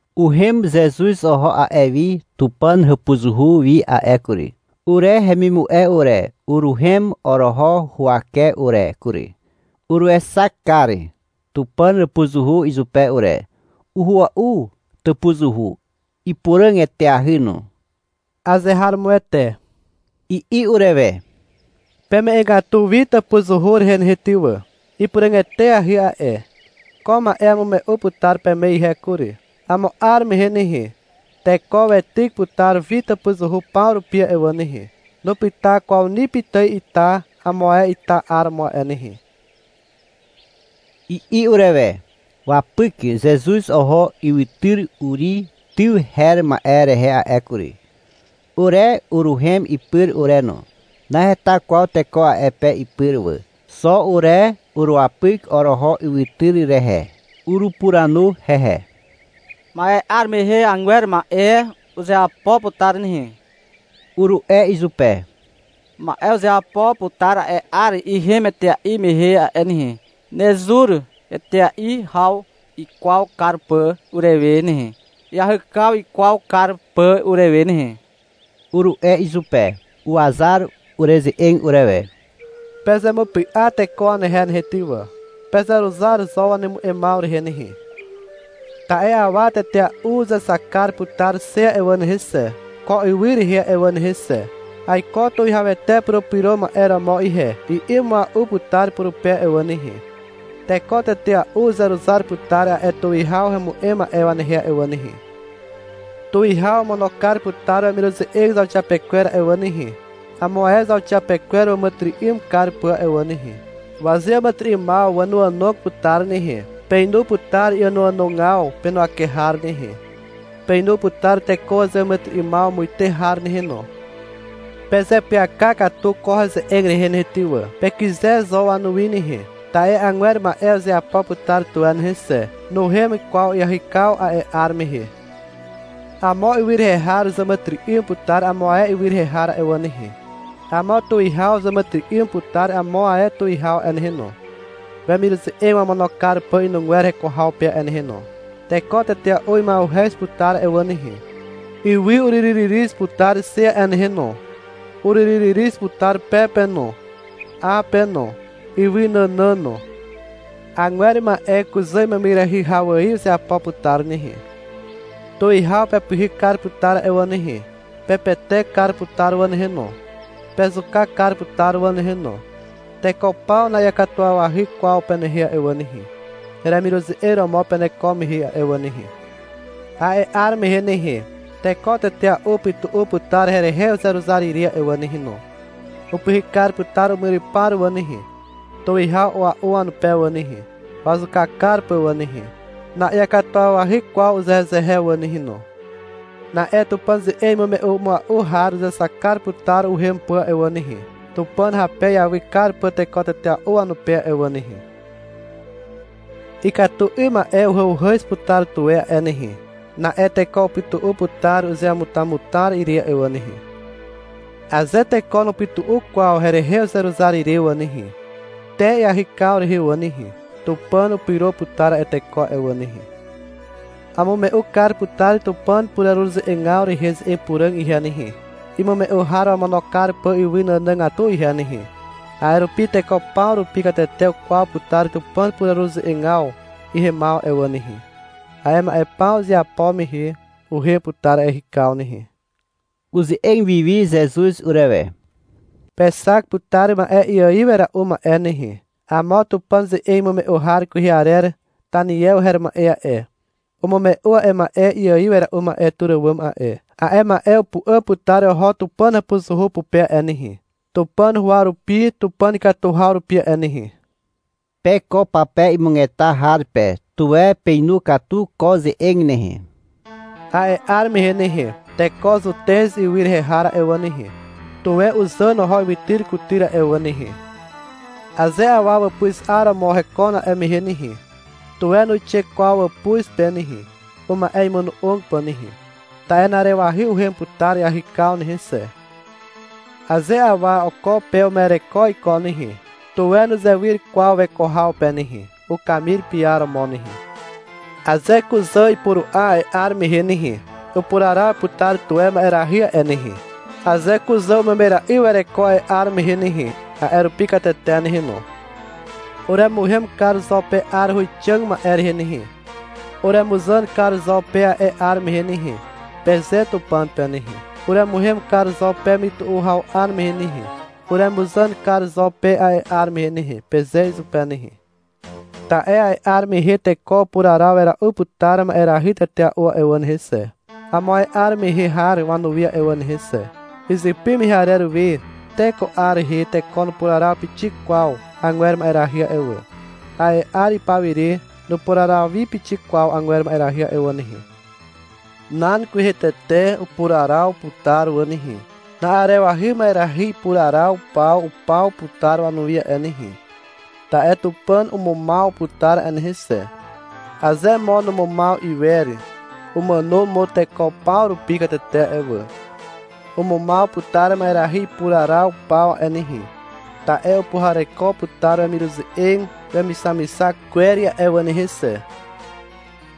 Uhem Zezuz oho a'e wi Tupàn hàpuzuhu wi a'e kury. Ure hemimu'e ure, uruhem oroho huwake ure kury. Uruexak kar Tupàn hàpuzuhu izupe ure. (Uhua'u tàpuzuhu. Ipuràg eteahy no.) — Azeharomoete, i'i urewe. — Peme'egatu wi tàpuzuhu rehe nehe ty wà. Ipuràg eteahy a'e. Ko ma'e amume'u putar peme ihe kury. Amo 'ar mehe nehe, teko weityk putar wi tàpuzuhu paw rupi a'e wà nehe. Nupyta kwaw ni pitài ita amo ae ita 'ar romo a'e nehe, i'i urewe. Wapyk Zezuz oho ywytyr Uri tyw her ma'e rehe a'e kury. Ure uruhem ipyr ure no. Naheta kwaw teko a'e pe ipyr wà. Xo ure uruwapyk oroho ywytyr rehe. Urupuranu hehe. — Ma'e 'ar mehe agwer ma'e uzeapo putar nehe, uru'e izupe. — Ma'e uzeapo putar a'e 'ar ihem etea'i mehe a'e nehe, nezur etea'i haw ikwaw kar pà urewe nehe, iahykaw ikwaw kar pà urewe nehe, uru'e izupe. Uwazar ureze'eg urewe. — Pezemupy'a teko wanehe nehe ty wà. Pezeruzar zo wanemu'emaw rehe nehe. Ta'e awa tetea'u uzexak kar putar xe a'e wà nehe xe, ko ywy rehe a'e wà nehe xe. — Aiko Tuwihawete Purupyro Ma'e romo ihe, i'i mua'u putar purupe a'e wà nehe. Teko tetea'u uzeruzar putar a'e tuwihaw hemu'em ma'e wanehe a'e wà nehe. Tuwihaw omono kar putar wemiruze'eg zauxiapekwer a'e wà nehe, amo ae zauxiapekwer wàmàtyry'ym kar pà a'e wà nehe. Wazeàmàtyry'ymaw wànoànog putar nehe. Peinu putar iànoànogaw penuwake har nehe. Peinu putar teko wazeàmàtyry'ymaw muite har nehe no. Pezeapyaka katu ko heze'eg rehe nehe ty wà. Pekyze zo wanuwi nehe. Ta'e agwer ma'e uzeapo putar tuwe nehe xe. Nuhem kwaw iahykaw a'e 'ar mehe. Amo ywy rehe har uzàmàtyry'ym putar amo ae ywy rehe har a'e wà nehe. Amo tuwihaw uzàmàtyry'ym putar amo ae tuwihaw a'e nehe no, wemiruze'eg wamono kar pà inugwer heko haw pe a'e nehe no. Teko tetea'u ima'uhez putar a'e wà nehe. Ywy uryryryryz putar xe a'e nehe no. Uryryryryz putar pe pe no, 'a pe no, ywy nànàn no. Agwer ma'e kuzà imemyrahy haw ài uzeapo putar nehe. Tuwihaw pepyhyk kar putar a'e wà nehe. Pepetek kar putar wà nehe no. Pezuka kar putar wà nehe no. Teko paw na'iakatuwawahy kwaw penehe a'e wà nehe, heremiruze'eg romo peneko mehe a'e wà nehe. A'e 'ar mehe nehe, teko tetea'u upytu'u putar herehe uzeruzar ire a'e wà nehe no. Upyhyk kar putar umyrypar wà nehe, tuwihaw a'ua'u wanupe wà nehe, wazuka kar pà wà nehe. Na'iakatuwawahy kwaw uzehezehe wà nehe no. Na'e Tupàn ze'eg imume'u mua'u har uzexak kar putar uhem pà a'e wà nehe, Tupàn hape iawy kar pà teko tetea'u wanupe a'e wà nehe. Ikatu 'ym ma'e uhàuhàz putar tuwe a'e nehe. Na'e teko upytu'u putar uzeamutamutar ire a'e wà nehe. Aze teko nupytu'u kwaw herehe uzeruzar ire wà nehe, te iahykaw rehe wà nehe, Tupàn upyro putar a'e teko a'e wà nehe. Amume'u kar putar Tupàn pureruze'egaw rehe ze'eg puràg ihe nehe, imume'u har wamono kar pà ywy nànàgatu ihe nehe. A'e rupi teko paw rupi katete ukwaw putar Tupàn pureruze'egaw ihemaw a'e wà nehe. A'e ma'e paw izeapo mehe, uhem putar iahykaw nehe. (Uze'eg wiwi Zezuz urewe.) — Pexak putar ma'e iaiw wera'u ma'e nehe. Amo Tupàn ze'eg imume'u har kwehe arer Taniew her ma'e a'e, umume'u a'e ma'e iaiw wera'u ma'e tur àwàm a'e. A'e ma'e upu'àm putar oho Tupàn hàpuzuhu pupe a'e nehe, Tupàn huwa rupi Tupàn ikatu haw rupi a'e nehe. (Pe ko pape imugeta har pe, tuwe peinu katu ko ze'eg nehe.) A'e 'ar mehe nehe, teko Zutez ywy rehe har a'e wà nehe, tuwe uzàn oho ywytyr kutyr a'e wà nehe. Aze awa wàpuz 'aromo hekon a'e mehe nehe, tuwe nuixe kwaw wàpuz pe nehe, uma'e imono'og pà nehe. Ta'e na'arewahy uhem putar iahykaw nehe xe. Aze awa oko pe uma'ereko iko nehe, tuwe nuzewyr kwaw weko haw pe nehe, ukamir piaromo nehe. Aze kuzà ipuru'a a'e 'ar mehe nehe, upuraraw putar tuwe ma'erahy a'e nehe. Aze kuzà umemyra'i wereko a'e 'ar mehe nehe, a'e rupi katete nehe no. — Uremuhem kar zo pe 'ar huwixàg ma'e rehe nehe. Uremuzàn kar zo pe a'e 'ar mehe nehe, peze Tupàn pe nehe. — Uremuhem kar zo pe mytu'u haw 'ar mehe nehe, uremuzàn kar zo pe a'e 'ar mehe nehe, peze izupe nehe. Ta'e a'e 'ar mehe teko upuraraw wera'u putar ma'erahy tetea'u a'e wà nehe xe, amo ae 'ar mehe har wanuwi a'e wà nehe xe, izypy mehe arer we te ko 'ar rehe teko nupuraraw pixik kwaw agwer ma'erahy a'e wà. A'e 'ar ipawire nupuraraw wi pixik kwaw agwer ma'erahy a'e wà nehe. Nan kwehe tete upuraraw putar wà nehe. Na'arewahy ma'erahy ipuraraw paw upaw putar wanuwi a'e nehe. Ta'e Tupàn umumaw putar a'e nehe xe. Aze mo numumaw iwer, umàno mo teko paw rupi katete a'e wà. Umumaw putar ma'erahy ipuraraw paw a'e nehe, ta'e upuhareko putar wemiruze'eg wemixamixak kwer a'e wà nehe xe.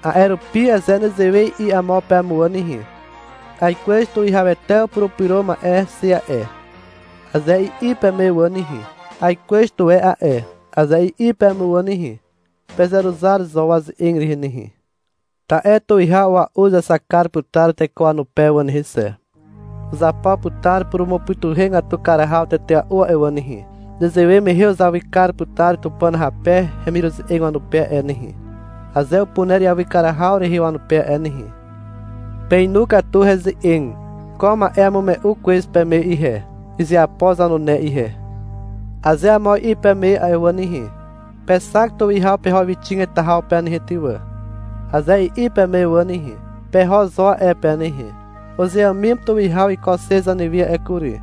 A'e rupi aze nezewe i'i amo peme wà nehe, — Aikwez Tuwihawete upurupyro ma'e xe a'e, aze i'i peme wà nehe, — Aikwez tuwe a'e, aze i'i peme wà nehe, pezeruzar zo waze'eg rehe nehe. Ta'e tuwihaw a'ua'u uzexak kar putar teko wanupe wà nehe xe. Uzapo putar purumupytuhegatu kar haw tetea'u a'e wà nehe. Nezewe mehe uzawy kar putar Tupàn hape hemiruze'eg wanupe a'e nehe, aze upuner iawy kar haw rehe wanupe a'e nehe. Peinu katu heze'eg. Ko ma'e amume'u kwez peme ihe, izeapo zanune ihe. Aze amo i'i peme a'e wà nehe, — Pexak tuwihaw peho ywyxig heta haw pe nehe ty wà, aze i'i peme wà nehe, peho zo a'e pe nehe. — Uzeàmim tuwihaw iko xe zanewi a'e kury,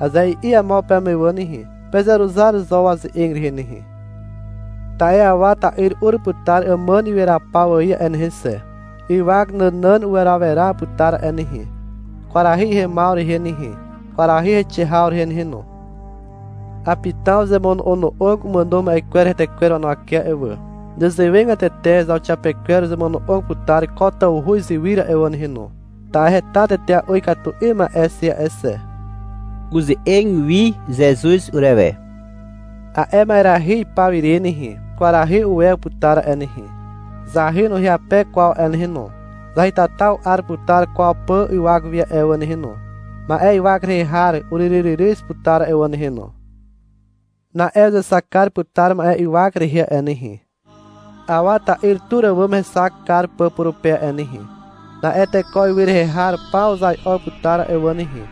aze i'i amo peme wà nehe, pezeruzar zo waze'eg rehe nehe. Ta'e Awa ta'yr ur putar àmàn iweraw paw ài a'e nehe xe. Ywak nànàn uweraweraw putar a'e nehe, kwarahy ihemaw rehe nehe, kwarahy heixe haw rehe nehe no. Apitaw uzemono'ono'og umàno ma'e kwer hetekwer wanuwake a'e wà. (Nezewegatete zauxiapekwer uzemono'og putar ko tawhu izywyr a'e wà nehe no, ta'e heta tetea'u ikatu 'ym ma'e xe a'e xe.) Uze'eg wi Zezuz urewe. — A'e ma'erahy ipaw ire nehe, kwarahy uwew putar a'e nehe, zahy nuhyape kwaw a'e nehe no. Zahytata u'ar putar kwaw pà ywak wi a'e wà nehe no. Ma'e ywak rehe har uryryryryz putar a'e wà nehe no. Na'e uzexak kar putar ma'e ywak rehe a'e nehe, Awa ta'yr tur àwàm hexak kar pà purupe a'e nehe. Na'e teko ywy rehe har paw uzai'o putar a'e wà nehe.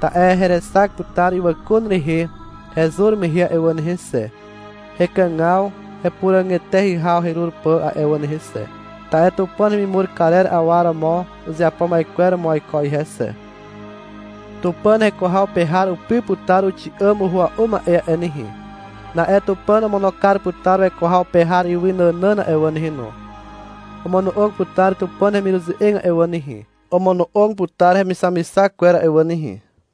Ta'e herexak putar ywàkun rehe hezur mehe a'e wà nehe xe, hekàgaw hepuràg eteahy haw herur pà a'e wà nehe xe. Ta'e Tupàn hemimur karer awa romo uzeapo ma'e romo aiko ihe xe. Tupàn heko haw pe har upy putar uxi'àm uhua'u ma'e a'e nehe. Na'e Tupàn omono kar putar weko haw pe har ywy nànàn a'e wà nehe no. Omono'og putar Tupàn hemiruze'eg a'e wà nehe, omono'og putar hemixamixak kwer a'e wà nehe.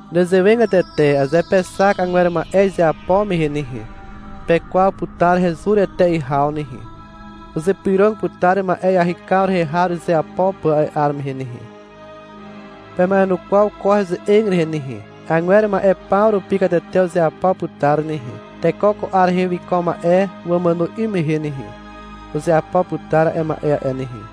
Nezewegatete aze pexak agwer ma'e izeapo mehe nehe, pekwaw putar hezur etea'i haw nehe. Uzypyrog putar ma'e iahykaw rehe har uzeapo pà a'e 'ar mehe nehe. Pema'enukwaw ko heze'eg rehe nehe. Agwer ma'e paw rupi katete uzeapo putar nehe. Teko ko 'ar rehe wiko ma'e wamàno 'ym mehe nehe, uzeapo putar a'e ma'e a'e nehe.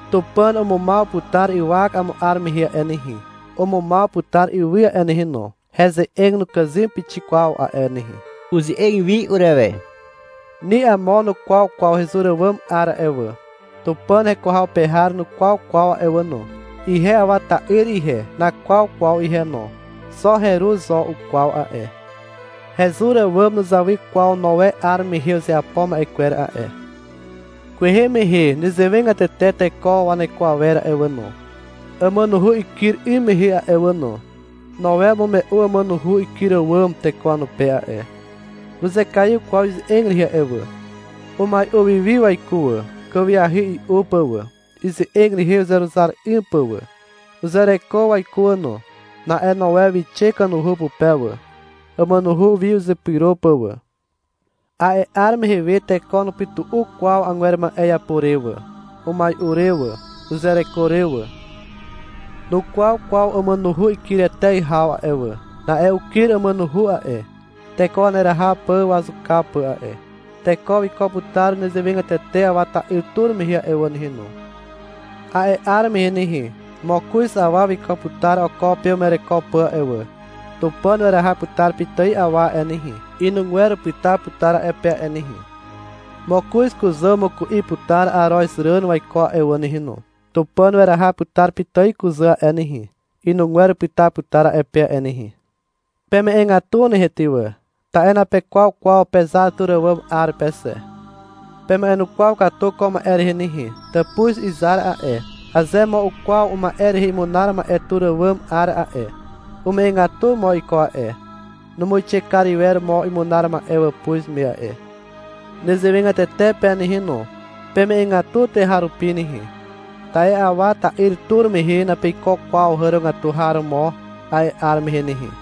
Tupàn umumaw putar ywak amo 'ar mehe a'e nehe. Umumaw putar ywy a'e nehe no. Heze'eg nukàzym pixik kwaw a'e nehe. Uze'eg wi urewe. — Ni amo nukwaw kwaw hezur àwàm 'ar a'e wà. Tupàn heko haw pe har nukwaw kwaw a'e wà no. Ihe Awa ta'yr ihe, nakwaw kwaw ihe no. Xo heru zo ukwaw a'e. Hezur àwàm nuzawy kwaw Noe 'ar mehe uzeapo ma'e kwer a'e. Kwehe mehe nezewegatete teko waneko awer a'e wà no, àmànuhu ikyr 'ym mehe a'e wà no. Noe umume'u àmànuhu ikyr àwàm teko wanupe a'e. Nuzekaiw kwaw ize'eg rehe a'e wà. Umai'u wi wi waiko wà, kàwiahy i'u pà wà, ize'eg rehe uzeruzar 'ym pà wà. Uzereko waiko wà no. Na'e Noe wixe kanuhu pupe wà, àmànuhu wi uzepyro pà wà. A'e 'ar mehe we teko nupytu'u kwaw agwer ma'e iapo re wà, umai'u re wà, uzereko re wà. Nukwaw kwaw àmànuhu ikyr etea'i haw a'e wà. Na'e ukyr àmànuhu a'e, teko waneraha pà wazuka pà a'e. Teko wiko putar nezewegatete Awa ta'yr tur mehe a'e wà nehe no. A'e 'ar mehe nehe, mokoz awa wiko putar oko pe uma'ereko pà a'e wà. Tupàn weraha putar pitài awa a'e nehe, inugwer upyta putar a'e pe a'e nehe. Mokoz kuzà umuku'i putar arozràn waiko a'e wà nehe no. Tupàn weraha putar pitài kuzà a'e nehe, inugwer upyta putar a'e pe a'e nehe. Peme'egatu nehe ty wà. Ta'e napekwaw kwaw pezar tur àwàm 'ar pe xe. Pema'enukwaw katu ko ma'e rehe nehe. Tàpuz izar a'e, aze mo ukwaw uma'e rehe imunar ma'e tur àwàm 'ar a'e, ume'egatu mo iko a'e. Numuixe kar iwer mo imunar ma'e wàpuz me a'e. Nezewegatete pe nehe no. Peme'egatu tuweharupi nehe. Ta'e Awa ta'yr tur mehe napeiko kwaw hàrogatu har romo a'e 'ar mehe nehe.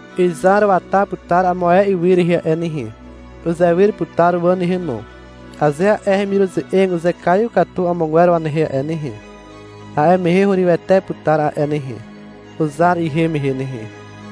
Izar wata putar amo ae ywy rehe a'e nehe. Uzewyr putar wà nehe no. Aze a'e hemiruze'eg uzekaiw katu amogwer wanehe a'e nehe, a'e mehe hurywete putar a'e nehe, uzar ihem mehe nehe.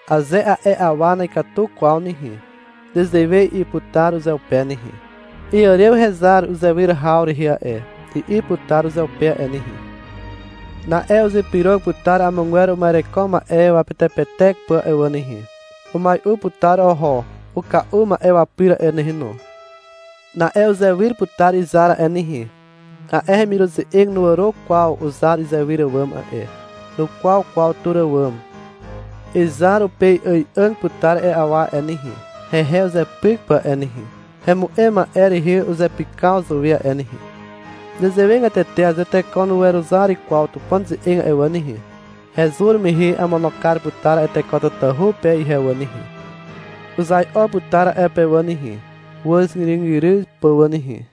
Aze a'e awa na'ikatu kwaw nehe, nezewe i'i putar uzeupe nehe. — Iàrew hezar uzewyr haw rehe a'e, i'i putar uzeupe a'e nehe. Na'e uzypyrog putar amogwer uma'ereko ma'e wapetepetek pà a'e wà nehe. Umai'u putar oho uka'u ma'e wapyr a'e nehe no. Na'e uzewyr putar izar a'e nehe. A'e hemiruze'eg nuàro kwaw uzar izewyr àwàm a'e. Nukwaw kwaw tur àwàm. Izar upei'ài'àg putar a'e awa a'e nehe, hehe uzepyk pà a'e nehe, hemu'em ma'e rehe uzepykaw zàwe a'e nehe. Nezewegatete aze teko nuweruzar kwaw Tupàn ze'eg a'e wà nehe, hezur mehe amono kar putar a'e teko tatahu pe ihe wà nehe. Uzai'o putar a'e pe wà nehe, wàzgyrygyryw pà wà nehe.